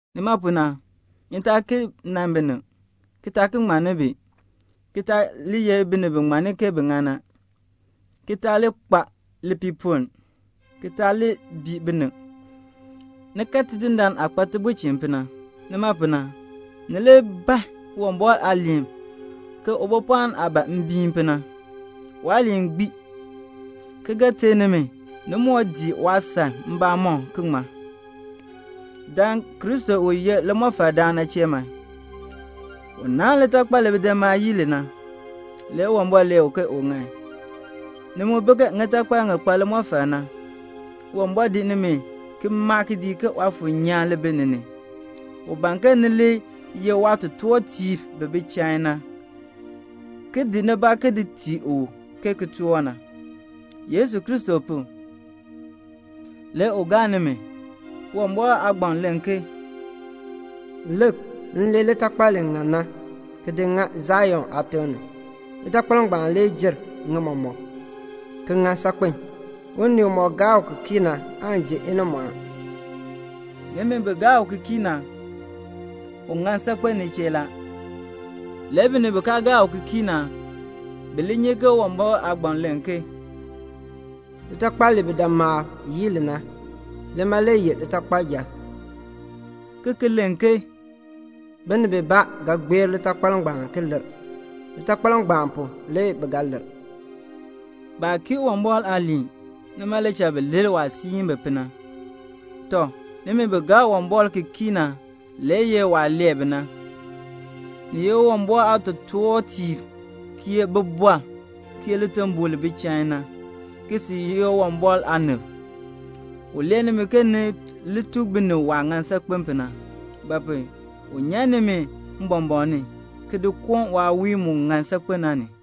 Nima pu na, ni taa ki nan binib, ki taa ki ŋmann bi, ki taa li ye binib bi ŋmanni ke bi ŋan na, ki taa li kpa lipiipoln, ki taa bii binib. Ni kan Tidindaan aah kpa tibulchin pu na. Nima pu na, ni li ban Uwumbɔr aaliin ke ubopɔɔn aah ban mbiin pu na. Waaliin gbii, ki ga ter nimi ni moo dii waasan mbamɔm, ki ŋmar. Dan Kristo u ye limɔfaldaan na chee man. U naahn litakpal li bidimaab yii li na. Le Uwumbɔr lee u ke u ŋan. Ni mu bi ke ŋitakpal ŋi kpa limɔfal na. Uwumbɔr di nimi ki maa kidiik ke Waafuur nyaan li bi ki ni. U ban ke ni li ye waatotoortiib bi bi chain na, ki di nibaa ki tii u ke kitork na. Yesu Kristo pu, le u ga gaa nimi. Uwumbɔr aagbaŋ len ke "Lik, m lee litakpal li ŋan na ki di ŋa Sion aatiŋ ni, Litakpal ngbaan le jer ŋi mɔmɔk, ki ŋan saakpen. Unii umɔk gaa u ki kii na aan ji inimɔɔn." Nimi bi gaa u ki kii na, u ŋan saakpen ni chee la. Le binib bi kaa gaa u ki kii na, bi li nyi ke Uwumbɔr aagbaŋ len ke "Litakpal li bidimaab yii li na, lima le ye litakpayil," ki ki len ke "Binib bibaa ga gbeer litakpal ngbaan ki lir. Litakpal ngbaan pu le bi ga lir." Baa kii Uwumbɔr aaliin; nima le cha bi lir waah siin bi pu na. Tɔ, nimi bi gaa Uwumbɔr ki kii na le ye waah lee bi na. Ni ye Uwumbɔr aatotoortiib, ki ye bibɔrb, ki ye litimbol li bi chain na, ki sil ye Uwumbɔr aanib. U lee nimi ke ni li tuk binib waah ŋan saakpen pu na; ba pu? u nyan nimi mbɔmbɔɔn ni, ki di koon waawiihn mu ŋan saakpen na ni.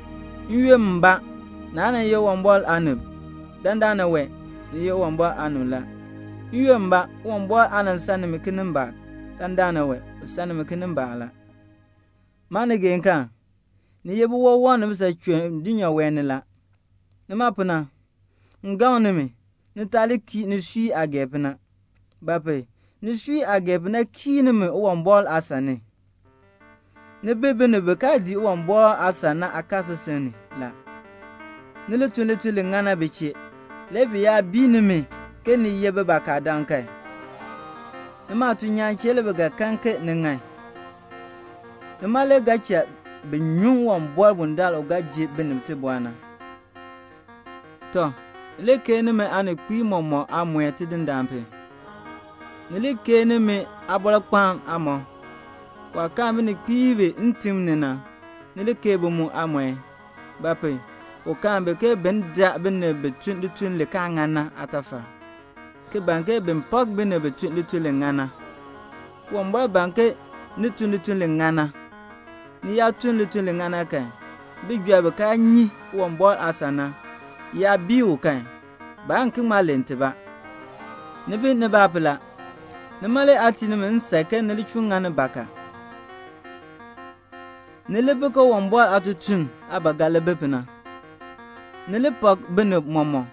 N-yoonn mbaa naa nan ye Uwumbɔr aanib. Dandana wee ni ye Uwumbɔr aanib la. N-yoonn mbaa Uwumbɔr aa nan san nimi kinimbaak. Dandana wee u san nimi kinimbaak la. Maanigeekaan, ni ye biwawam ni bisachum dulnyaa wee ni. Nima pu na m gaŋ nimi, ni taa kii nisui aah gee pu na; ba pu? nisui aah gee pu na kiir nimi Uwumbɔr aasan ni. Ni bi binib bi kaa dii Uwumbɔr aasan na aakaasisik ni la. Ni li tun lituln li ŋan na bi chee. Le bi yaa bii nimi ke ni ye bakadam kan, nimi aatuln nyaan chee le bi ga kan ke ni ŋan. Nima le ga cha bin nyuŋ Uwumbɔr bundaln u ga ji binib tibɔr na. Tɔ, ni li keei nimi aaninkpiib mɔmɔk aamɔi Tidindaan pu. Ni li keei nimi aabɔrkpaan aamɔb. Waah kaan bininkpiib ntim ni na, ni li keei bi mu aamɔi. Ba pu? u kaan bi ke bin daa binib bi tun lituln li kaa ŋan na aatafal, ki ban ke bin pak binib bi tun lituln li ŋan na. Uwumbɔr ban ke ni tun lituln li ŋan na. Ni yaa tun lituln li ŋan na kan, bijɔrb bi kaa nyi Uwumbɔr aasan na yaa bii u kan, baan ki ŋma len tibaa. Ni bi nibaa pu la. Nima le aa tii nimi nsan ke ni li chuun ŋani bakaa. Ni li bi ke Uwumbɔr aatutum aah ba ga li bi pu na. Ni li pak binib mɔmɔk,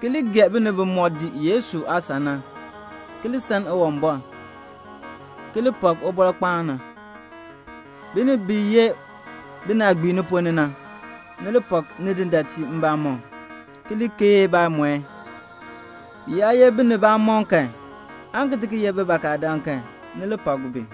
ki li gee binib bimɔk dii Yesu aasan na, ki li san Uwumbɔr, ki li pak ubɔrkpaan na. Binib bi ye binaagbiib ni ponn ni na, ni li pak nidindaatiib mbamɔm, ki li keei baamɔi. Bi yaa ye binibamɔm kan, aan ki ti ki ye bakadam kan, ni li pak bi.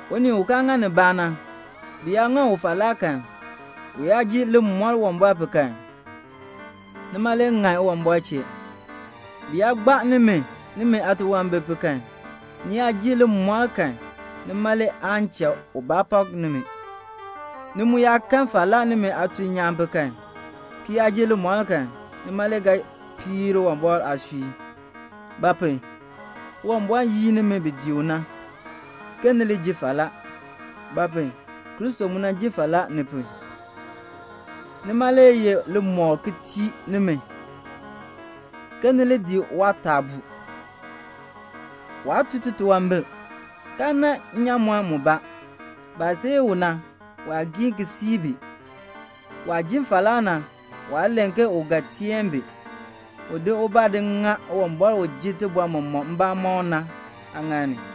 Unii u kaa ŋa nibaa na, bi yaa ŋa u falaa kan, u yaa ji limɔr Uwumbɔr pu kan, nima le ŋan Uwumbɔr chee. Bi yaa gbaa nimi, nimi aatunwambir pu kan, ni yaa ji limɔr kan, nima le aan cha ubaa pak nimi. Ni mu yaa kan falaa nimi aatuln nyaan pu kan, ki yaa ji limɔr kan, nima le ga piir Uwumbɔr aasui. Ba pu? Uwumbɔr yin nimi bi dii u na ke ni li ji falaa; ba pu? Kristo mu jin falaa ni pu. Nima le ye limɔkl ki tii nimi, ke ni li dii waataabuu. Waa tun titunwambir, kaa nan nnyaamɔn mubaa. Baah seei u na, waa giin ki sii bi. Waah jin falaa na, waa len ke u ga teen bi. U di ubaa di ŋa Uwumbɔr u ji tibɔr mɔmɔk mbamɔm na aaŋaal ni.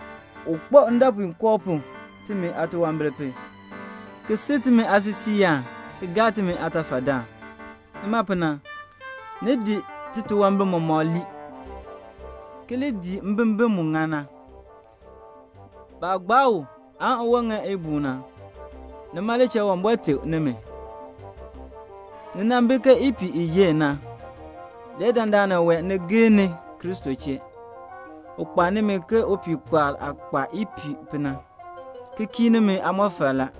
U kpo ndɔpuinkoo pu timi aatunwambir pu, ki sil timi aasisiiyaan ki gaa timi aatafadaan. Nima pu na, ni di titunwambir mɔmɔk ki lii, ki li dii mbimbin mu ŋan na. Baah gbaa u, uwon ŋa ibuun na, nima le cha Uwumbɔr teb nimi. Ni nan bi ke ipiih i yenn na, le dandana wee ni gir ni Kristo chee. U kpaa nimi ke upihkpaal aah kpaa ipiih pu na, ki kii nimi aamɔfal la.